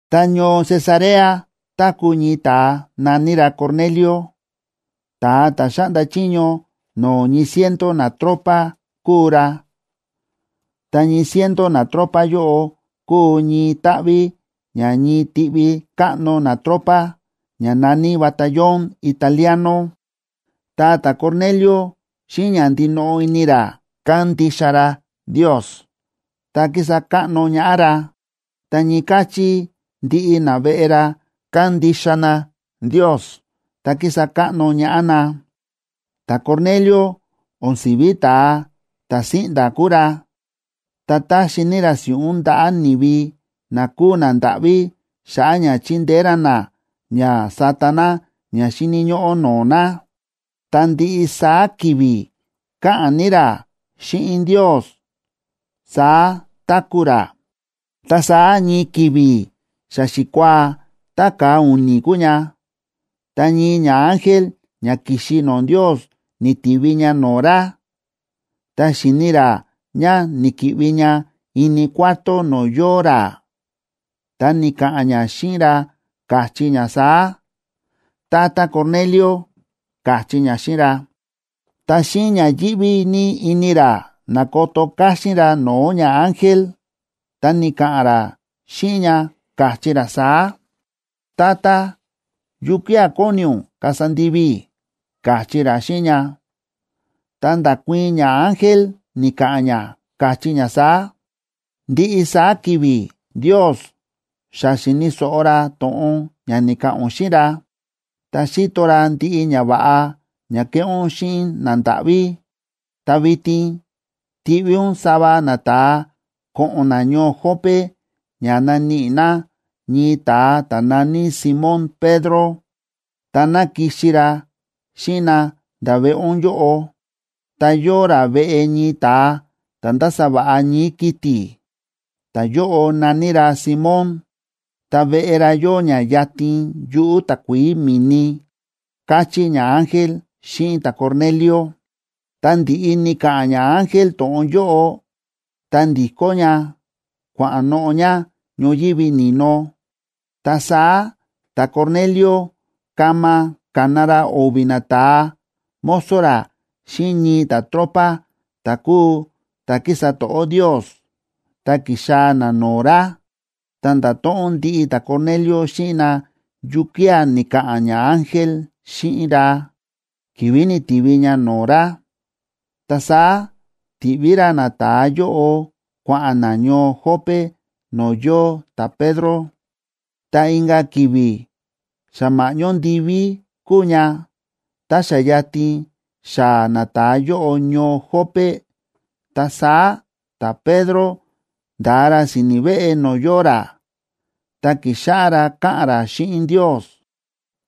Ta ñoo Cesarea táku̱ ñii ta̱a na̱ní ra Cornelio, ta̱a ta̱ xáꞌnda chiño no̱o̱ ñii ciento natropa kúu ra. Ta ñii ciento natropa yóꞌo kúu ñii táꞌví ña ñii tiꞌvi káꞌno natropa, ña na̱ní Batallón Italiano. Ta ta̱Cornelio xíꞌin ña ndinoꞌo ini ra kándixa ra Ndios ta kísa káꞌno ñaꞌá ra. Ta ñii káchí ndiꞌi naveꞌe ra kándixa na Ndios ta kísa káꞌno ñaꞌá na. Ta̱Cornelio o̱n si̱ví ta̱a ta̱ síꞌnda̱ kúu ra, ta táxi ní ra si̱ꞌún ndaꞌa̱ ni̱vi na kúu nandáꞌví xa̱ꞌa̱ ña chi̱ndeé ra na ña sata na ña xíni̱ ñóꞌó no̱o̱ na. Ta ndiꞌi saá ki̱vi̱ káꞌa̱n ní ra xíꞌin Ndios, saá táku̱ ra. Ta saá ñii ki̱vi̱ xa xikuaa ta ka̱a u̱ni̱ kúu ña,a ta ñii ñaángel ña ki̱xi no̱o̱ Ndios ni̱tivi ña no̱o̱ ra, ta xi̱ni ra ña ni̱ki̱ꞌvi ña ini cuarto no̱o̱ yóo ra, ta ni̱ka̱ꞌa̱n ña xíꞌin ra, káchí ña saá: ―¡Tata Cornelio! ―káchí ña xíꞌin ra. Ta xíꞌin ña yíꞌví ní ini ra na̱koto káxín ra no̱o̱ ñaángel, ta ni̱ka̱ꞌa̱n ra xíꞌin ña, káchí ra saá: ―Tata, ¿yukía̱ kóni ún kasa ndivi i̱? ―káchí ra xíꞌin ña. Ta nda̱kuii̱n ñaángel, ni̱ka̱ꞌa̱n ña káchí ña saá: ―Ndiꞌi saá ki̱vi̱ Ndios xa xíni̱ so̱ꞌo ra to̱ꞌon ña ni̱ka̱ꞌa̱n ún xíꞌin ra, ta xíto ra ndiꞌi ñava̱ꞌa ña ke̱ꞌé ún xíꞌin nandáꞌví. Ta vitin tiꞌví ún sava nata̱a ko̱ꞌo̱n na ñoo Jope ña naníꞌi na ñii ta̱a ta̱ na̱ní Simón Pedro, ta ná kixi ra xíꞌin na nda̱ veꞌe ún yóꞌo. Ta yóo ra veꞌe ñii ta̱a ta̱ ndása va̱ꞌa ñii̱ kiti̱, ta̱yóꞌo na̱ní ra Simón, ta veꞌe ra yóo ña yatin yuꞌu̱ takuií mi̱ni ―káchí ñaángel xíꞌin ta̱Cornelio. Tá ndi̱ꞌi ni̱ka̱ꞌa̱n ñaángel to̱ꞌon yóꞌo, ta ndi̱kó ña kua̱ꞌa̱n noꞌo̱ ña ñoyívi ni̱no. Ta saá ta̱Cornelio kama ka̱na ra o̱vi̱ nata̱a mozo ra xíꞌin ñii ta̱tropa ta̱ kúu ta̱ kísa to̱ꞌó Ndios, ta ki̱xaa̱ na no̱o̱ ra. Ta nda̱to̱ꞌon ndiꞌi ta̱Cornelio xíꞌin na yukía̱ ni̱ka̱ꞌa̱n ñaángel xíꞌin ra, ki̱vi̱ ni̱tivi ña no̱o̱ ra. Ta saá ti̱ꞌví ra nata̱a yóꞌo kua̱ꞌa̱n na ñoo Jope no̱o̱ yóo ta̱Pedro. Ta inka̱ ki̱vi̱ xa ma̱ꞌñó ndiví kúu ña,b ta xa yatin xaa̱ nata̱a yóꞌo ñoo Jope, ta saá ta̱Pedro nda̱a ra si̱ni̱ veꞌe no̱o̱ yóo ra, ta ki̱xáꞌá ra káꞌa̱n ra xíꞌin Ndios.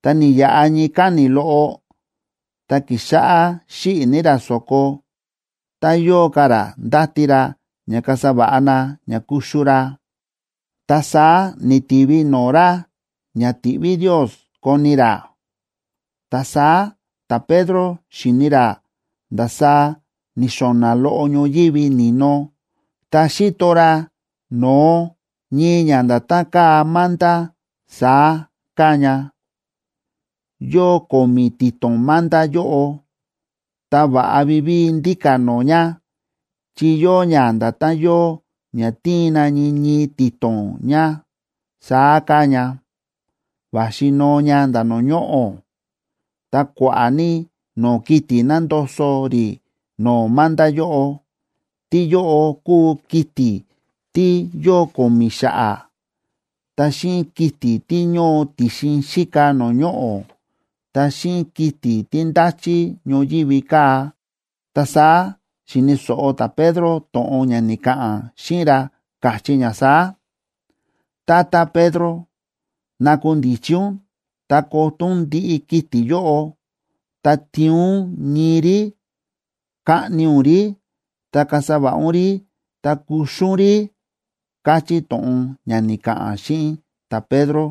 Ta ni̱yaꞌa ñii káni̱ loꞌo, ta ki̱xáꞌá xíꞌi̱ ní ra so̱ko, ta yóo ka̱ ra ndáti ra ña kasa va̱ꞌa na ña kuxu ra, ta saá ni̱tivi no̱o̱ ra ña ti̱ꞌví Ndios koni ra. Ta saá ta̱Pedro xi̱ni ra ndasaá ni̱xo̱na̱ loꞌo ñoyívi ni̱no, ta xi̱to ra no̱o ñii ña nda̱tán káa manta, saá káa ña. Yóo ko̱mi̱ ti̱to̱n manta yóꞌo, ta va̱ꞌa vivíi ndíka̱ no̱o̱ ña, chi yóo ña nda̱tán yóo ña tíin na ñii ñii ti̱to̱n ña, saá káa ña, va̱xi noo ña nda̱ no̱o̱ ñoꞌo̱. Ta kua̱ꞌa̱ ní no̱o̱ kiti̱ nándoso rí no̱o̱ manta yóꞌo. Tíyóꞌo kúu kiti̱ tí yóo ko̱mi̱ xa̱ꞌa̱, ta xíꞌin kiti̱ tí ñóo ti̱xin xíka no̱o̱ ñoꞌo̱, ta xíꞌin kiti̱ tí ndáchí ñoyívi kaa̱. Ta saá xi̱ni̱ so̱ꞌo ta̱Pedro to̱ꞌon ña ni̱ka̱ꞌa̱n xíꞌin ra, káchí ña saá: ―Tata Pedro, nakundichi ún, ta koto ún ndiꞌi kiti̱ yóꞌo, ta tiin ún ñii rí, kaꞌni ún rí, ta kasa va̱ꞌa ún rí, ta kuxu ún rí ―káchí to̱ꞌon ña ni̱ka̱ꞌa̱n xíꞌin ta̱Pedro.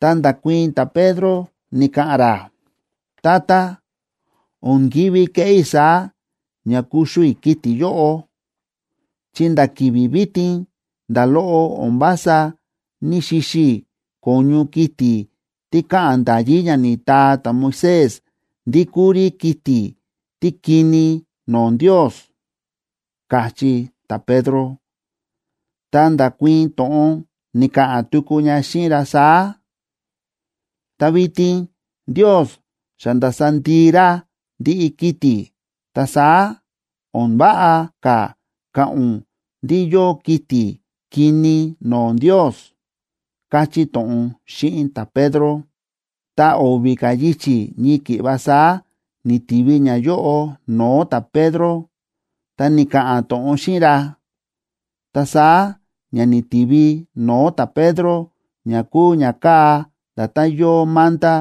Ta nda̱kuii̱n ta̱Pedro, ni̱ka̱ꞌa̱n ra: ―Tata, o̱n ki̱ví keꞌé i̱ saá ña kuxu i̱ kiti̱ yóꞌo, chi nda̱ ki̱vi̱ vitin nda̱ loꞌo o̱n vása ní‑xixi i̱ ko̱ñu kiti̱ tí káꞌa̱n nda̱yí ña ni̱taa ta̱Moisés ndí kúu rí kiti̱ tí kini no̱o̱ Ndios ―káchí ta̱Pedro. Ta nda̱kuii̱n to̱ꞌon, ni̱ka̱ꞌa̱n tuku ña xíꞌin ra saá: ―Ta vitin Ndios xa nda̱sa ndii ra ndiꞌi kiti̱. Ta saá, o̱n váꞌa ka̱ ka̱ꞌa̱n ún ndí yóo kiti̱ kini no̱o̱ Ndios ―káchí to̱ꞌon xíꞌin ta̱Pedro. Ta o̱vi̱ ka̱ yichi̱ ñii ki̱ꞌva saá ni̱tivi ñayóꞌo no̱o̱ ta̱Pedro, ta ni̱ka̱ꞌa̱n to̱ꞌon xíꞌin ra. Ta saá ña ni̱tivi no̱o̱ ta̱Pedro ña kúu ña káa nda̱tán yóo manta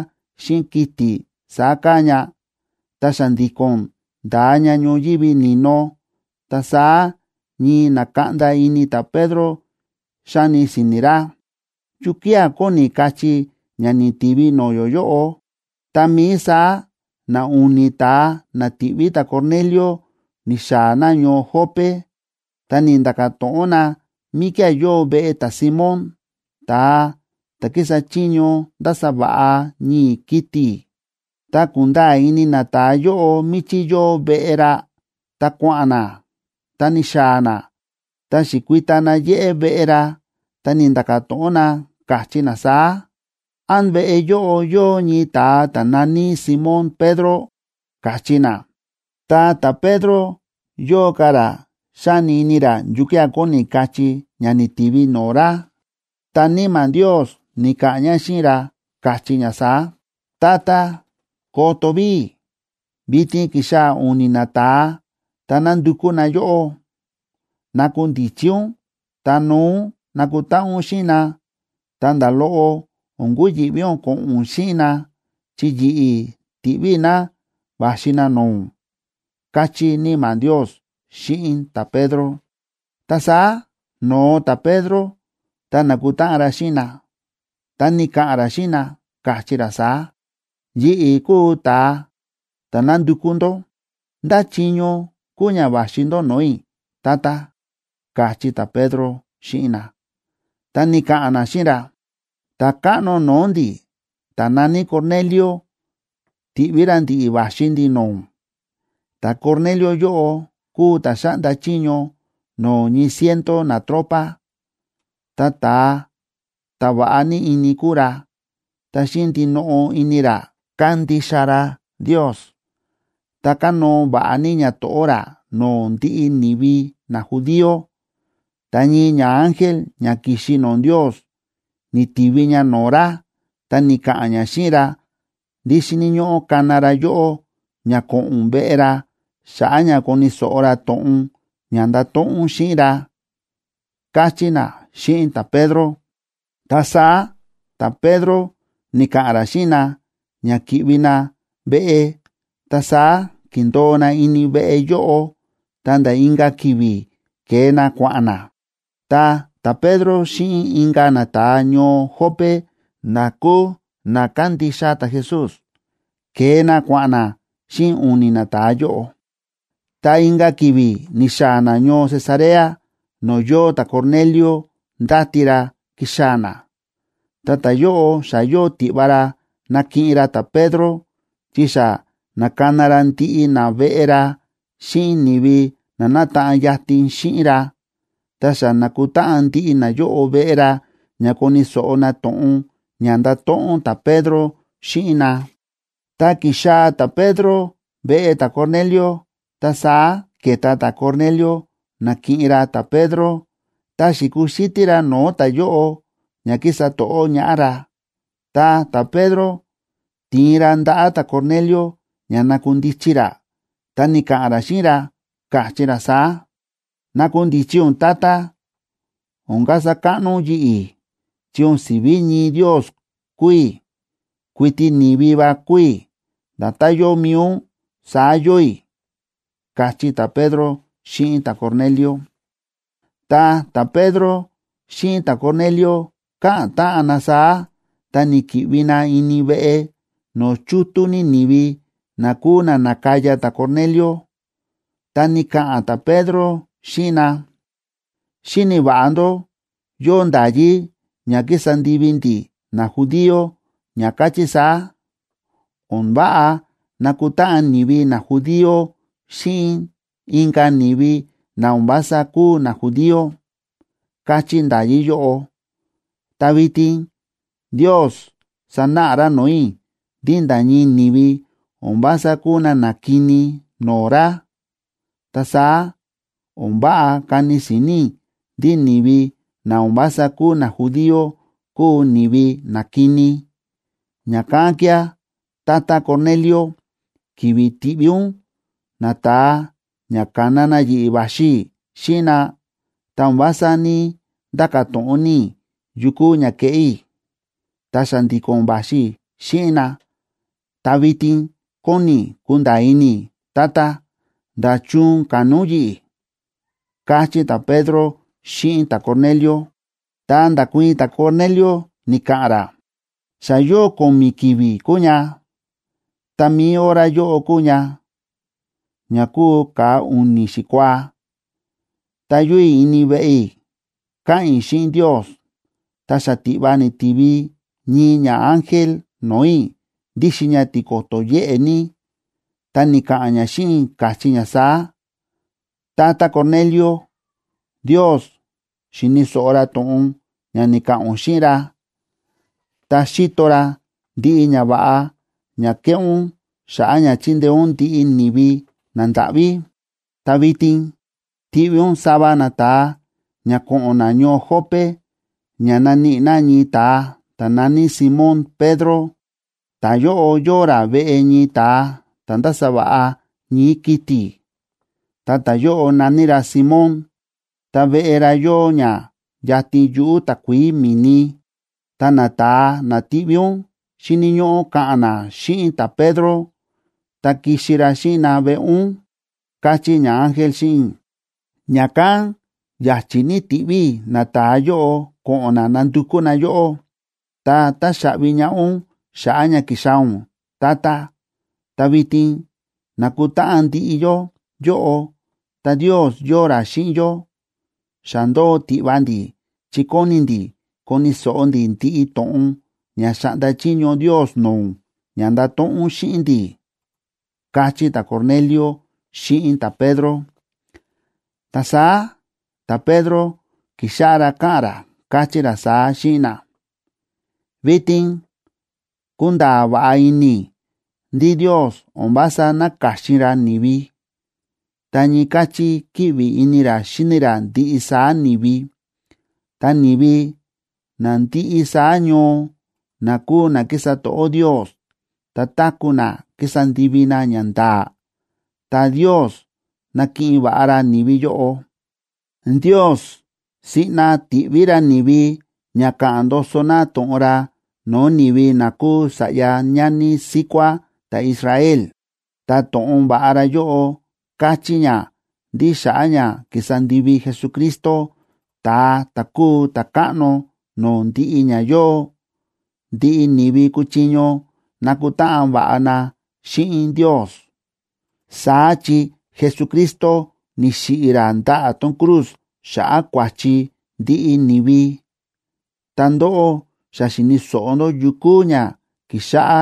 xíꞌin kiti̱ saá káa ña, ta xa̱ndi̱ko̱n nda̱a ña ñoyívi ni̱no. Ta saá ñii nákaꞌnda ini ta̱Pedro, xáni si̱ni̱ ra: ―¿Yukía̱ kóni kachí ña ni̱tivi no̱o̱ yó yóꞌo? Tá mií saá na u̱ni̱ ta̱a na ti̱ꞌví ta̱Cornelio ni̱xaa̱ na ñoo Jope, ta ni̱nda̱ka̱ to̱ꞌon na míkía̱ yóo veꞌe ta̱Simón, ta̱a ta̱ kísa chiño ndása va̱ꞌa ñii̱ kiti̱. Tá ku̱nda̱a̱ ini nata̱a yóꞌo míchí yóo veꞌe ra, ta kua̱ꞌa̱n na, ta ni̱xaa̱ na, ta xi̱kui̱ta na yéꞌé veꞌe ra, ta ni̱nda̱ka̱ to̱ꞌon na, káchí na saá: ―¿Án veꞌe yóꞌo yóo ñii ta̱a ta̱ na̱ní Simón Pedro? ―káchí na. Ta ta̱Pedro yóo ka̱ ra xáni ini ra yukía̱ kóni kachí ña ni̱tivi no̱o̱ ra. Ta Níma̱ Ndios ni̱ka̱ꞌa̱n ña xíꞌin ra, káchí ña saá: ―¡Tata, koto ví! Vitin ki̱xaa̱ u̱ni̱ nata̱a ta nándukú na yóꞌó. Nakundichi ún ta noo ún nakutáꞌan ún xíꞌin na, ta nda̱ loꞌo o̱n kuyi̱ꞌví ún ko̱ꞌo̱n ún xíꞌin na, chi yi̱ꞌi̱ ti̱ꞌví i̱ na va̱xi na no̱o̱ ún ―káchí Níma̱ Ndios xíꞌin ta̱Pedro. Ta saá no̱o ta̱Pedro ta na̱kutáꞌan ra xíꞌin na, ta ni̱ka̱ꞌa̱n ra xíꞌin na, káchí ra saá: ―Yi̱ꞌi̱ kúu ta̱a ta̱ nándukú ndó. ¿Ndá chiño kúu ña va̱xi ndó no̱o̱ i̱, tata? ―káchí ta̱Pedro xíꞌin na. Ta ni̱ka̱ꞌa̱n na xíꞌin ra: ―Ta̱káꞌno no̱o̱ ndi̱ ta̱ na̱ní Cornelio, ti̱ꞌví ra ndi̱ꞌi̱ va̱xi ndi̱ no̱o̱ ún. Ta̱Cornelio yóꞌo kúu ta̱ xáꞌnda chiño no̱o̱ ñii ciento natropa, ta ta̱a ta̱ va̱ꞌa ní ini kúu ra, ta xíꞌin ndinoꞌo ini ra kándixa ra Ndios, ta kánóo va̱ꞌa ní ñato̱ꞌó ra no̱o̱ ndiꞌi ni̱vi najudío. Ta ñii ñaángel ña ki̱xi no̱o̱ Ndios ni̱tivi ña no̱o̱ ra, ta ni̱ka̱ꞌa̱n ña xíꞌin ra ndí xíni̱ ñóꞌó kana ra yóꞌó ña ko̱ꞌo̱n ún veꞌe ra xa̱ꞌa̱ ña koni̱ so̱ꞌo ra to̱ꞌon ña ndato̱ꞌon ún xíꞌin ra ―káchí na xíꞌin ta̱Pedro. Ta saá ta̱Pedro ni̱ka̱ꞌa̱n ra xíꞌin na ña ki̱ꞌvi na veꞌe, ta saá ki̱ndo̱o na ini veꞌe yóꞌo ta̱nda̱ inka̱ ki̱vi̱ ke̱e na kua̱ꞌa̱n na. Ta ta̱Pedro xíꞌin inka̱ nata̱a ñoo Jope na kúu na kándixa ta̱Jesús, ke̱e na kua̱ꞌa̱n na xíꞌin u̱ni̱ nata̱a yóꞌo. Ta inka̱ ki̱vi̱ ni̱xaa̱ na ñoo Cesarea no̱o̱ yóo ta̱Cornelio ndáti ra kixaa̱ na. Ta ta̱yóꞌo xa yóo tiꞌva ra nakiꞌin ra ta̱Pedro, chi xa na̱kana ra ndiꞌi naveꞌe ra xíꞌin ni̱vi na nátaꞌan yatin xíꞌin ra, ta xa na̱kutáꞌan ndiꞌi nayóꞌo veꞌe ra ña koni̱ so̱ꞌo na to̱ꞌon ña ndato̱ꞌon ta̱Pedro xíꞌin na. Tá ki̱xaa̱ ta̱Pedro veꞌe ta̱Cornelio, ta saá ke̱ta ta̱Cornelio nakiꞌin ra ta̱Pedro, ta xi̱kuxítí ra no̱o̱ ta̱yóꞌo ña ki̱sa to̱ꞌó ñaꞌá ra. Ta ta̱Pedro ti̱in ra ndaꞌa̱ ta̱Cornelio ña na̱kundichi ra, ta ni̱ka̱ꞌa̱n ra xíꞌin ra, káchí ra saá: ―Nakundichi ún, tata, o̱n kasa káꞌno ún yi̱ꞌi̱, chi o̱n si̱ví ñii ndios kúu i̱, kuiti ni̱vi va kúu i̱, nda̱tán yóo mi̱i ún, saá yóo i̱ ―káchí ta̱Pedro xíꞌin ta̱Cornelio. Tá ta̱Pedro xíꞌin ta̱Cornelio káꞌa̱n táꞌan na saá, ta ni̱ki̱ꞌvi na ini veꞌe, no̱o̱ chútú ní ni̱vi na kúu na na̱kaya ta̱Cornelio. Ta ni̱ka̱ꞌa̱n ta̱Pedro xíꞌin na: ―Xíni̱ va̱ꞌa ndó yóo nda̱yí ña kísa ndivi ndi̱ najudío ña káchí saá: O̱n váꞌa nakutáꞌan ni̱vi najudío xíꞌin inka̱ ni̱vi na o̱n vása kúu najudío, káchí nda̱yí yóꞌo. Ta vitin Ndios sa̱náꞌa ra no̱o̱ i̱, ndí nda̱ ñii ni̱vi o̱n vása kúu na na kini no̱o̱ ra, ta saá o̱n váꞌa kani si̱ni̱ i̱ ndí ni̱vi na o̱n vása kúu najudío kúu ni̱vi na kini. Ña̱kán kía̱, tata Cornelio, ki̱vi̱ ti̱ꞌví ún nata̱a ña ka̱na na yi̱ꞌi̱ va̱xi i̱ xíꞌin na, ta o̱n vása ní‑nda̱ka̱ to̱ꞌon ní i̱ yu kuu ña keꞌé i̱, ta xa̱ndi̱ko̱n va̱xi i̱ xíꞌin na. Ta vitin kóni i̱ kunda̱a̱ ini i̱, tata, ¿nda̱chun ka̱na ún yi̱ꞌi̱? ―káchí ta̱Pedro xíꞌin ta̱Cornelio. Ta nda̱kuii̱n ta̱Cornelio, ni̱ka̱ꞌa̱n ra: ―Xa yóo ko̱mi̱ ki̱vi̱ kúu ña, tá mi̱i hora yóꞌo kúu ña, ña kúu ka̱a u̱ni̱ xikuaa,c ta yóo i̱ ini veꞌe i̱ káꞌa̱n i̱ xíꞌin Ndios. Ta xatiꞌva ni̱tivi ñii ñaángel no̱o̱ i̱ ndíxin ña tiko̱to̱ yéꞌe ní. Ta ni̱ka̱ꞌa̱n ña xíꞌin i̱, káchí ña saá: “Tata Cornelio, Ndios xi̱ni̱ so̱ꞌo ra to̱ꞌon ña ni̱ka̱ꞌa̱n ún xíꞌin ra, ta xi̱to ra ndiꞌi ñava̱ꞌa ña ke̱ꞌé ún xa̱ꞌa̱ ña chi̱ndeé ún ndiꞌi ni̱vi nandáꞌví. Ta vitin tiꞌví ún sava nata̱a ña ko̱ꞌo̱n na ñoo Jope ña naníꞌi na ñii ta̱a ta̱ na̱ní Simón Pedro. Ta̱yóꞌo yóo ra veꞌe ñii ta̱a ta̱ ndása va̱ꞌa ñii̱ kiti̱, ta ta̱yóꞌo na̱ní ra Simón, ta veꞌe ra yóo ña yatin yuꞌu̱ takuií mi̱ni. Ta nata̱a na tiꞌví ún xíni̱ ñóꞌó ka̱ꞌa̱n na xíꞌin ta̱Pedro ta kixi ra xíꞌin na veꞌe ún”, káchí ñaángel xíꞌin i̱. Ña̱kán ya̱chi̱ ní ti̱ꞌví i̱ nata̱a yóꞌo ko̱ꞌo̱n na nandukú na yóꞌó. Ta táxaꞌvi ñaꞌá ún xa̱ꞌa̱ ña ki̱xaa̱ ún, tata. Ta vitin na̱kutáꞌan ndiꞌi yó yóꞌo, ta Ndios yóo ra xíꞌin yó. Xa ndóo tiꞌva ndi̱, chi kóni ndi̱ koni̱ so̱ꞌo ndi̱ ndiꞌi to̱ꞌon ña xa̱ꞌnda chiño Ndios no̱o̱ ún ña ndato̱ꞌon ún xíꞌin ndi̱ ―káchí ta̱Cornelio xíꞌin ta̱Pedro. Ta saá ta̱Pedro ki̱xáꞌá ra káꞌa̱n ra, káchí ra saá xíꞌin na: ―Vitin kúnda̱a̱ va̱ꞌa ini i̱ ndí Ndios o̱n vása náka̱xin ra ni̱vi, ta ñii káchí kíꞌvi ini ra xíni ra ndiꞌi saá ni̱vi. Ta ni̱vi na ndiꞌi saá ñoo na kúu na kísa to̱ꞌó Ndios ta táku̱ na kísa ndivi na ñanda̱a̱, ta Ndios nákiꞌin va̱ꞌa ra ni̱vi yóꞌo. Ndios siꞌna ti̱ꞌví ra ni̱vi ña ka̱ꞌa̱n ndoso na to̱ꞌon ra no̱o̱ ni̱vi na kúu sa̱ꞌya ñani síkuá ta̱Israel. Ta to̱ꞌon va̱ꞌa ra yóꞌo káchí ña ndí xa̱ꞌa̱ ña ki̱sa ndivi Jesucristo, ta̱a ta̱ kúu Ta̱káꞌno no̱o̱ ndiꞌi ña yóo, ndiꞌi ni̱vi kúchiño nakutáꞌan va̱ꞌa na xíꞌin Ndios, saá chi Jesucristo ni̱xiꞌi̱ ra ndaꞌa̱ tón cruz xa̱ꞌa̱ kua̱chi ndiꞌi ni̱vi. Ta ndóꞌó xa xi̱ni̱ so̱ꞌo ndó yu kúu ña ki̱xáꞌá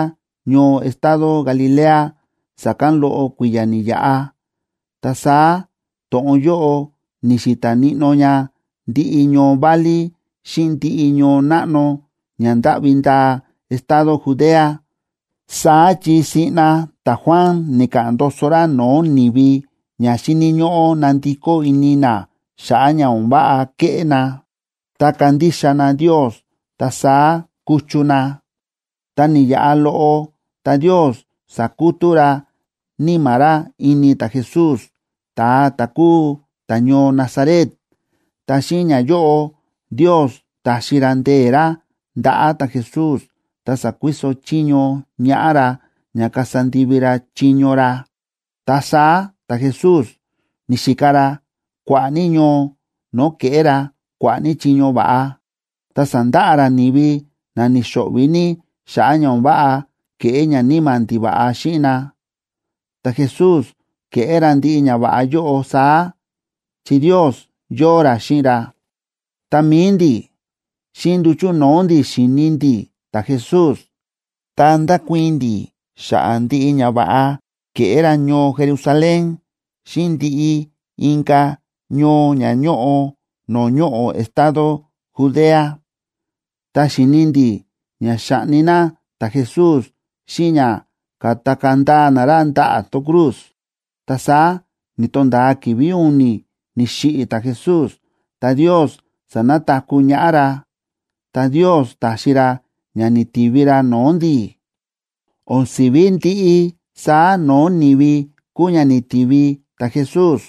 ñoo estado Galilea sa̱kán loꞌo kui̱ya̱ ni̱yaꞌa, ta saá to̱ꞌon yóꞌo ni̱xi̱ta̱ níꞌnó ña ndiꞌi ñoo válí xíꞌin ndiꞌi ñoo náꞌno ña ndáꞌvi ndaa estado Judea. Saá chi siꞌna ta̱Juan ni̱ka̱ꞌa̱n ndoso ra no̱o̱ ni̱vi ña xíni̱ ñóꞌó nandikó ini na xa̱ꞌa̱ ña o̱n váꞌa kéꞌé na, ta kandixa na Ndios ta saá kuchu na. Ta ni̱yaꞌa loꞌo, ta Ndios sa̱kutú ra Níma̱ ra ini ta̱Jesús, ta̱a ta̱ kúu ta̱ñoo Nazaret, ta xíꞌin ñayóꞌo, Ndios ta̱xi ra ndee̱ ra ndaꞌa̱ ta̱Jesús ta sa̱kuiso chiño ñaꞌá ra ña kasa ndivi ra chiño ra. Ta saá ta̱Jesús ni̱xika ra kua̱ꞌa̱ ní ñoo no̱o̱ kéꞌé ra kua̱ꞌa̱ ní chiño va̱ꞌa, ta sa̱ndaꞌa ra ni̱vi na ni̱xo̱ꞌvi̱ ní xa̱ꞌa̱ ña o̱n váꞌa ke̱ꞌé ñaníma̱ ndiva̱ꞌa xíꞌin na. Ta̱Jesús ke̱ꞌé ra ndiꞌi ñava̱ꞌa yóꞌo saá, chi Ndios yóo ra xíꞌin ra. Ta mi̱i ndi̱, xíꞌin nduchu̱ no̱o̱ ndi̱ xi̱ni ndi̱ ta̱Jesús, ta ndákuii̱n ndi̱ xa̱ꞌa̱ ndiꞌi ñava̱ꞌa ke̱ꞌé ra ñoo Jerusalén xíꞌin ndiꞌi inka̱ ñoo ña ñóꞌo no̱o̱ ñoꞌo̱ estado Judea. Ta xi̱ni ndi̱ ña xa̱ꞌni na ta̱Jesús xíꞌin ña ka̱takaa̱ ndaa na ra ndaꞌa̱ tón cruz. Ta saá ni̱to̱nda̱a ki̱vi̱ u̱ni̱ ni̱xiꞌi̱ ta̱Jesús, ta Ndios sa̱nataku̱ ñaꞌá ra, ta Ndios ta̱xi ra ña ni̱tivi ra no̱o̱ ndi̱. O̱n si̱ví ndiꞌi saá no̱o̱ ni̱vi kúu ña ni̱tivi ta̱Jesús,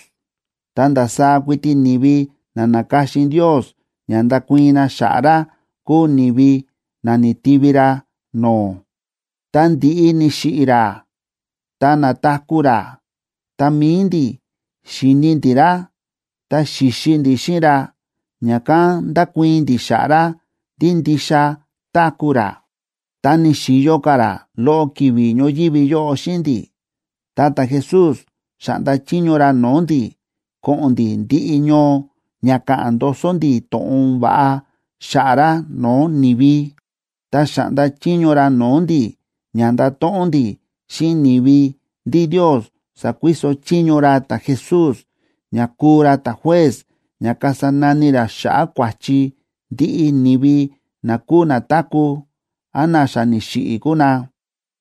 ta ndasaá kuiti ni̱vi na na̱ka̱xin Ndios ña ndakuii̱n na xa̱ꞌa̱ ra kúu ni̱vi na ni̱tivi ra no̱o̱. Tá ndi̱ꞌi ni̱xiꞌi̱ ra ta na̱taku̱ ra, ta mi̱i ndi̱ xi̱ni ndi̱ ra, ta xi̱xi ndi̱ xíꞌin ra, ña̱kán ndákuii̱n ndi̱ xa̱ꞌa̱ ra ndí ndixa táku̱ ra. Tá ni̱xi̱yo ka̱ ra loꞌo ki̱vi̱ ñoyívi yóꞌo xíꞌin ndi̱, ta ta̱Jesús xa̱ꞌnda chiño ra no̱o̱ ndi̱ ko̱ꞌo̱n ndi̱ ndiꞌi ñoo ña ka̱ꞌa̱n ndoso ndi̱ to̱ꞌon va̱ꞌa xa̱ꞌa̱ ra no̱o̱ ni̱vi. Ta xa̱ꞌnda chiño ra no̱o̱ ndi̱ ña ndato̱ꞌon ndi̱ xíꞌin ni̱vi ndí Ndios sa̱kuiso chiño ra ta̱Jesús ña kúu ra ta̱juez ña kasa nani ra xa̱ꞌa̱ kua̱chi ndiꞌi ni̱vi na kúu na táku̱, án na xa ni̱xiꞌi̱ kúu na.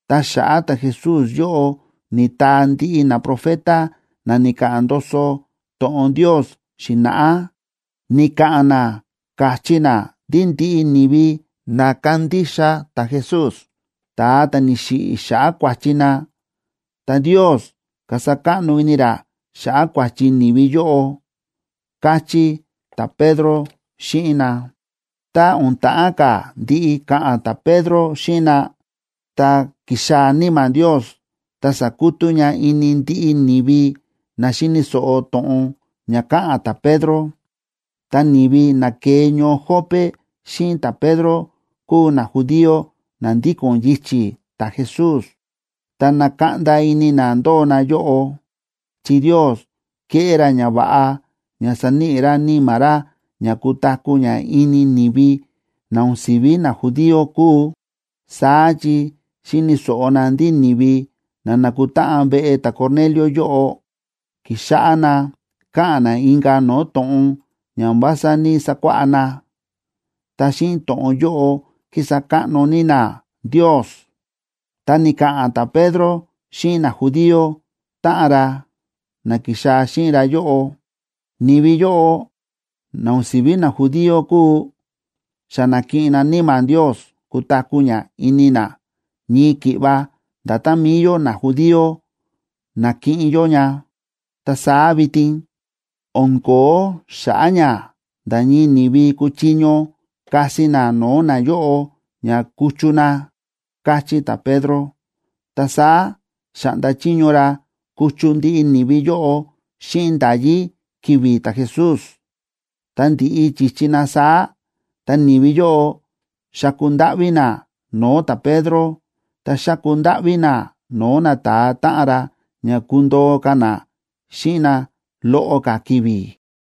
Ta xa̱ꞌa̱ ta̱Jesús yóꞌo ni̱taa ndiꞌi naprofeta na ni̱ka̱ꞌa̱n ndoso to̱ꞌon Ndios xi̱na̱ꞌá. Ni̱ka̱ꞌa̱n na káchí na ndí ndiꞌi ni̱vi na kandixa ta̱Jesús, ta̱a ta̱ ni̱xiꞌi̱ xa̱ꞌa̱ kua̱chi na, ta Ndios kasa káꞌno ini ra xa̱ꞌa̱ kua̱chi ni̱vi yóꞌo ―káchí ta̱Pedro xíꞌin na. Tá o̱n ta̱ꞌán ka̱ ndiꞌi ka̱ꞌa̱n ta̱Pedro xíꞌin na, ta ki̱xaa̱ Níma̱ Ndios, ta sa̱kutú ña ini ndiꞌi ni̱vi na xíni̱ so̱ꞌo to̱ꞌon ña káꞌa̱n ta̱Pedro. Ta ni̱vi na ke̱e ñoo Jope xíꞌin ta̱Pedro kúu najudío na ndíko̱n yichi̱ ta̱Jesús, ta na̱kaꞌnda ini na ndóo na yóꞌo, chi Ndios ke̱ꞌé ra ñava̱ꞌa ña sa̱níꞌi ra Níma̱ ra ña kutaku̱ ña ini ni̱vi na o̱n si̱ví najudío kúu. Saá chi xi̱ni̱ so̱ꞌo na ndí ni̱vi na na̱kutáꞌan veꞌe ta̱Cornelio yóꞌo, ki̱xáꞌá na káꞌa̱n na inka̱ no̱o̱ to̱ꞌon ña o̱n vása ní‑sakuáꞌá na, ta xíꞌin to̱ꞌon yóꞌo kísa káꞌno ní na Ndios. Ta ni̱ka̱ꞌa̱n ta̱Pedro xíꞌin najudío táꞌan ra, na ki̱xaa̱ xíꞌin ra yóꞌo: ―Ni̱vi yóꞌo na o̱n si̱ví najudío kúu, xa na̱kiꞌin na Níma̱ Ndios kutaku̱ ña ini na ñii ki̱ꞌva nda̱tán mi̱i yó najudío na̱kiꞌin yó ña. Ta saá vitin, o̱n ko̱ó xa̱ꞌa̱ ña nda̱ ñii ni̱vi kuchiño kasi na no̱o̱ nayóꞌo ña kuchu na ―káchí ta̱Pedro. Ta saá xa̱ꞌnda chiño ra kuchu ndiꞌi ni̱vi yóꞌo xíꞌin nda̱yí ki̱vi̱ ta̱Jesús. Ta ndi̱ꞌi chi̱chi na saá, ta ni̱vi yóꞌo xa̱ku ndáꞌví na no̱o̱ ta̱Pedro ta xa̱ku ndáꞌví na no̱o̱ nata̱a táꞌan ra ña kundoo ka̱ na xíꞌin na loꞌo ka̱ ki̱vi̱.